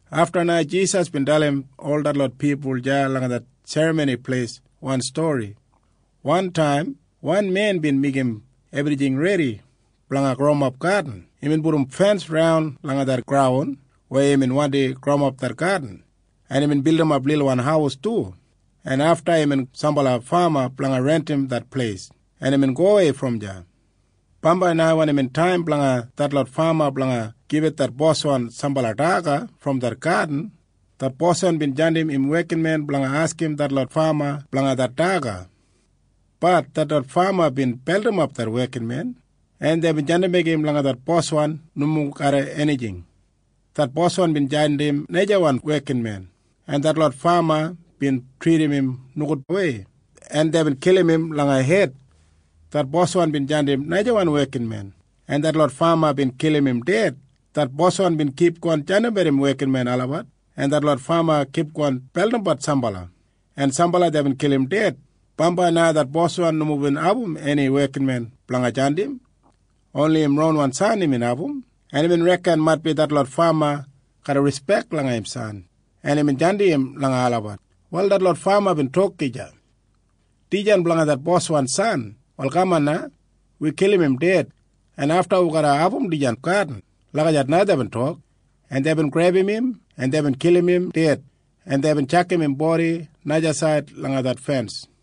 Afta na Jisas bin dalim ol detlot pipul deya langa det Serramoni Pleis wan stori, “Wantaim wan men bin meigim ebrijing redi blanga growimap gadin. Imbin pudum fens raun langa det graun weya imbin wandi growimap det gadin, en imbin bildimap lilwan haiwan haus du, en afta imbin gedim sambala fama blanga rentim det pleis, en imbin gowei brom deya. Bambai na wen imbin taim blanga detlot fama blanga gibit det boswan sambala daga brom det gadin, det boswan bin jandim im wekinmen blanga askim detlot fama blanga det daga. Bat detlot fama bin beldimap det wekinmen, en deibin jandimbek im langa det boswan nomo garram enijing. Det boswan bin jandim najawan wekinmen, en detlot fama bin tridim im nogudwei, en deibin kilim im langa hed. Det boswan bin jandim najawan wekinmen, en detlot fama bin kilim im ded. Det boswan bin kipgon jandimbat im wekinmen olabat, en detlot fama bin kipgon beldimbat sambala, en sambala deibin kilim ded. Bambai na det boswan nomo bin abum eni wekinmen blanga jandim. Oni im ronwan san imbin abum, en imbin reken maitbi detlot fama garra rispek langa im san. En imbin jandim im langa olabat. Wal detlot fama bin tok gija, ‘Dijan blanga det boswan san. Wal kaman na. Wi kilim im ded, en afta wi garra abum dijan gadin.’ Lagijat na deibin tok, en deibin grebum im, en deibin kilim im ded, en deibin tjakam im bodi najasaid langa det fens.”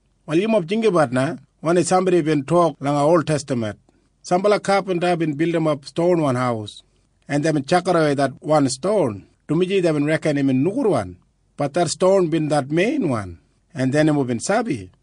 Wal yumob jinggabat na wanim sambodi bin tok langa oltestaman, ‘Sambala kapinta bin bildimap stonwan haus, en deibin tjakidawei det wan ston, dumaji deibin reken imbin nogudwan. Bat det ston bin det meinwan, en dei nomo bin sabi.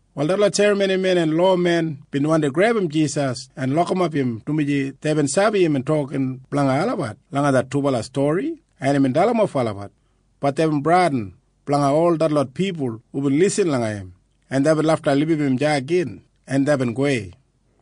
Wal detlot serramonimen en lowamen bin wandi grebum Jisas en lokimap im, dumaji deibin sabi imbin tokin blanga olabat langa det dubala stori en imbin dalimof olabat. Bat deibin bradin blanga ol detlot pipul hubin lisin langa im, en deibin lafta libum im deya gin, en deibin gowei.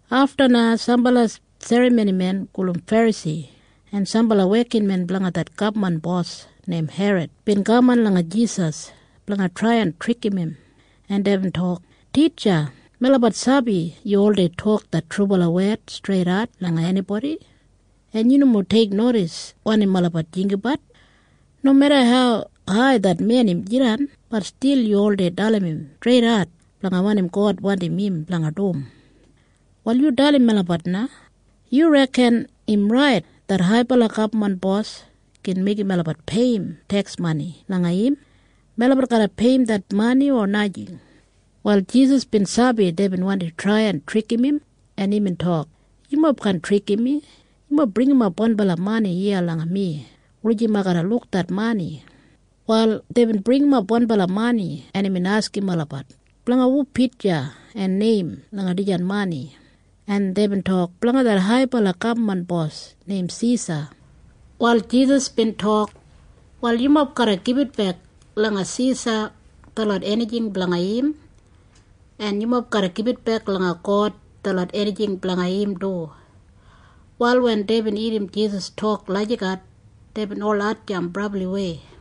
Afta na sambala serramonimen gulum Ferasi en sambala wekinmen blanga det gabman bos neim Herod bin kaman langa Jisas blanga trai en trikim im, en deibin tok, “Titja, melabat sabi yu oldei tok det trubala wed streidat langa enibodi, en yu nomo teiknodis wanim olabat jinggabat. Nomeda hau hai det men im jidan, bat stil yu oldei dalim im streidat blanga wanim God wandim im blanga dum. Wal yu dalim melabat na. Yu reken im rait det haibala gabman bos gin meigim melabat peiyim teks mani langa im? Melabat garra peiyim det mani o najing?” Wal Jisas bin sabi deibin wandi trai en trikim im, en imbin tok, “Yumob kaan trikim mi. Yumob bringimap wanbala mani iya langa mi blanga luk.” Wal deibin bringimap wanbala mani, en imbin askim olabat, “Blanga hu pitja en neim langa dijan mani?” En deibin tok, “Blanga det haibala gabman bos neim Sisa.” Wal Jisas bin tok, “Wal yumob garra gibitbek langa Sisa detlot enijing blanga im, en yumob garra gibitbek langa God detlot enijing blanga im du.” Wal wen deibin irrim Jisas tok lagijat, deibin ol hatjamp brabliwei.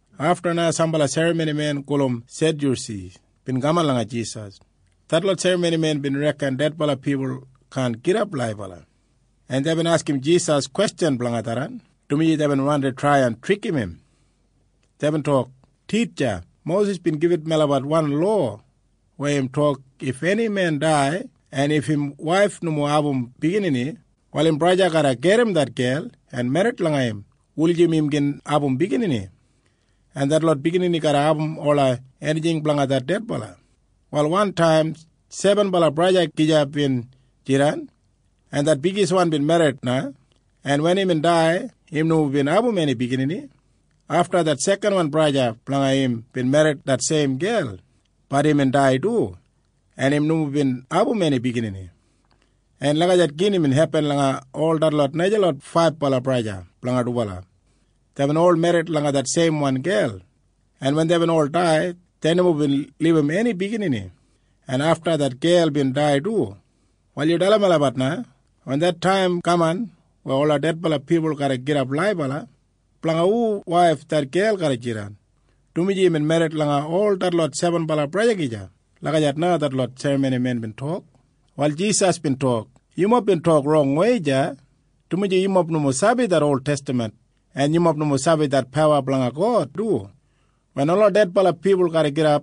Afta na sambala serramonimen gulum Sedyusi bin kaman langa Jisas. Detlot serramonimen bin reken dedbala pipul kaan gidap laibala, en deibin askim Jisas kwestjan blanga tharran, dumaji deibin wandi trai en trikim im. Deibin tok, “Titja, Mosis bin gibit melabat wan lowa weya im tok if eni men dai en im waif nomo bin abum biginini, wal im braja garra gedim det gel en merrit langa im en wen dubala abum biginini, detlot biginini garra abum ola enijing blanga det dedbala braja. Wal wantaim sebenbala braja gija bin jidan, en det bigiswan bin merrit na, en wen imbin dai, im nomo bin abum eni biginini. Afta det sekanwan braja blanga im bin merrit det seim gel. Bat imbin dai du, en im nomo bin abum eni biginini. En lagijat gin imbin hepin langa ol detlot najalot faibala braja blanga dubala. Deibin ol merrit langa det seimwan gel, en wen deibin ol dai, dei nomo bin libum eni biginini, en afta det gel bin dai du. Wal yu dalim melabat na. Wen det taim kaman weya ola dedbala pipul garra gidap laibala, blanga hu waif det gel garra jidan, dumaji imbin merrit langa ol detlot sebenbala braja gija?” Lagijat na detlot serramonimen bin tok. Wal Jisas bin tok, “Yumob bin tok rongwei deya, dumaji yumob nomo sabi det oltestaman, en yumob nomo sabi det pawa blanga God du. Wen ola dedbala pipul garra gidap,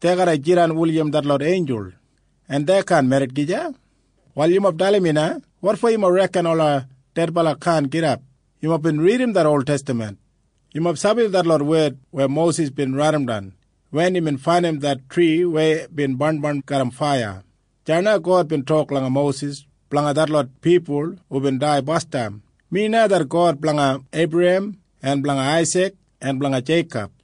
dei garra jidan jis laiga detlot einjul, en dei kaan merrit gija. Wal yumob dalim mi na. Wotfo yumob reken ola dedbala kaan gidap? Yumob bin ridim det oltestaman. Yumob sabi detlot wed weya Mosis bin raidimdan wen imbin faindim det tri weya bin barnbarn garram faiya. Deya na God bin tok langa Mosis blanga detlot pipul hubin dai basdam, ‘Mi na det God blanga Eibrahem en blanga Aisik en blanga Jeikob.’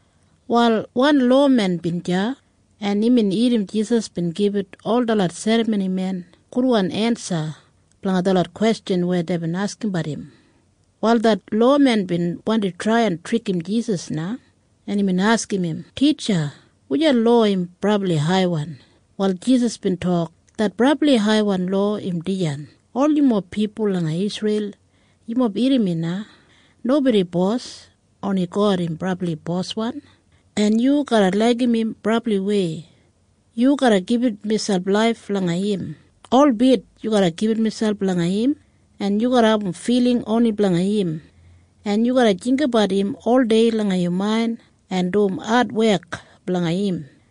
Wal wan lowamen bin deya, en imbin irrim Jisas bin gibit ol detlot serramonimen gudwan ensa blanga detlot kwestjan weya deibin askimbat im. Wal det lowamen bin wandi trai en trikim Jisas na, en imbin askim im, “Titja, wujan lowa im brabli haiwan?” Wal Jisas bin tok, “Det brabli haiwan lowa im dijan. ‘Ol yumob pipul langa Isreil, yumob irrim na. Nobodi bos. Oni God im brabli Boswan, en yu garra laigim im brabliwei. Yu garra gibit miselp laif langa im. Holbit yu garra gibit miselp langa im, en yu garra abum filing oni blanga im, en yu garra jinggabat im oldei langa yu main en dum adwek blanga im.’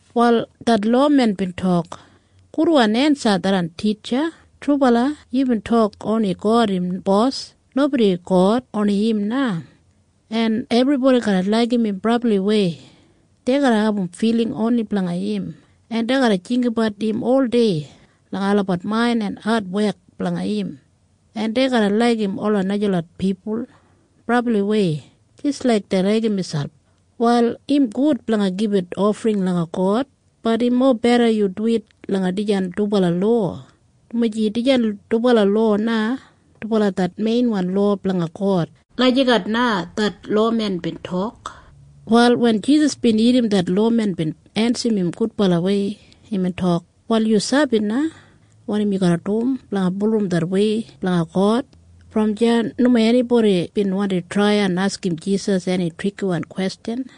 Wal det lowamen bin tok, “Gudwan ensa tharran, Titja. Trubala yubin tok oni God im Bos. Nobodi God. Oni im na, en ebribodi garra laigim im brabliwei. Dei garra abum filing oni blanga im, en dei garra jinggabat im oldei langa olabat main en adwek blanga im, en dei garra laigim ola najalot pipul brabliwei jis laik dei laigim miselp. Wal im gud blanga gibit ofring langa God. Bat im mobeda yu duwit langa dijan dubala lowa, dumaji dijan dubala lowa na dubala det meinwan lowa blanga God.” Lagijat na det lowamen bin tok. Wal wen Jisas bin irrim det lowamen bin ensim gudbalawei, imbin tok, “Wal yu sabi na wanim yu garra dum blanga bulurrum det wei blanga God.” Brom deya nomo enibodi bin wandi trai askim Jisas eni trikiwan kwestjan.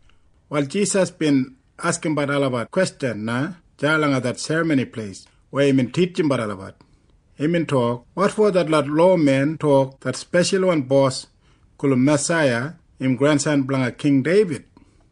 Wal Jisas bin askimbat olabat kwestjan na deya langa det Serramoni Pleis weya imbin titjimbat olabat. Imbin tok, “Wotfo detlot lowamen tok det speshalwan Bos gulum Masaiya im grensan blanga King Deibid?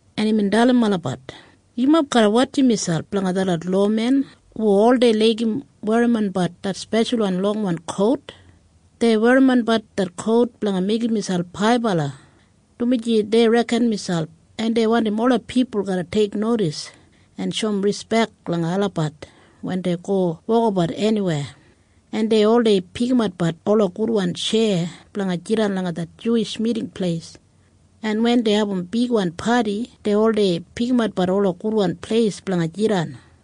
en imbin dalim olabat, “Yumob garra wotjim miselp blanga detlot lowamen hu oldei laigim werrimonbat det speshalwan longwan kout. Dei werrimonbat det kout blanga meigim miselp haibala, dumaji dei reken miselp, en dei wandim ola pipul garra teiknodis en shoum rispek langa olabat wen dei go wokabat eniweya. En dei oldei pikimat ola gudwan tjeya blanga jidan langa det Juwish Miting Pleis, en wen dei abum bigwan padi, dei oldei pikimat ola gudwan pleis blanga jidan.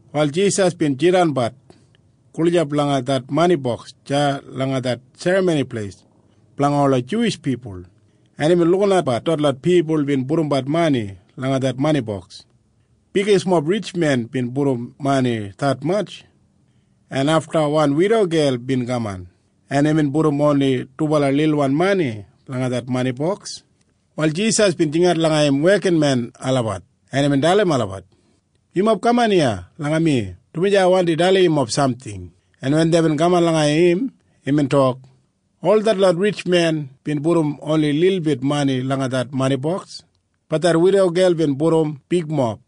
Wal Jisas bin jidanbat gulijap langa det mani boks deya langa det Serramoni Pleis blanga ola Juwish pipul, en imbin lukinatbat detlot pipul bin pudumbat mani langa det mani boks. Loda ritjmen bin pudum detmatj mani, en afta wan widogel bin kaman, en imbin pudum oni dubala lilwan mani langa det mani boks. Wal Jisas bin jingat langa im wekinmen olabat, en imbin dalim olabat, “Yumob kaman iya langa mi, dumaji ai wandim dalim yumob samting.” En wen deibin kaman langa im, imbin tok, “Ol detlot ritjmen bin pudum oni lilbit mani langa det mani boks. Bat det widogel bin pudum bigmob.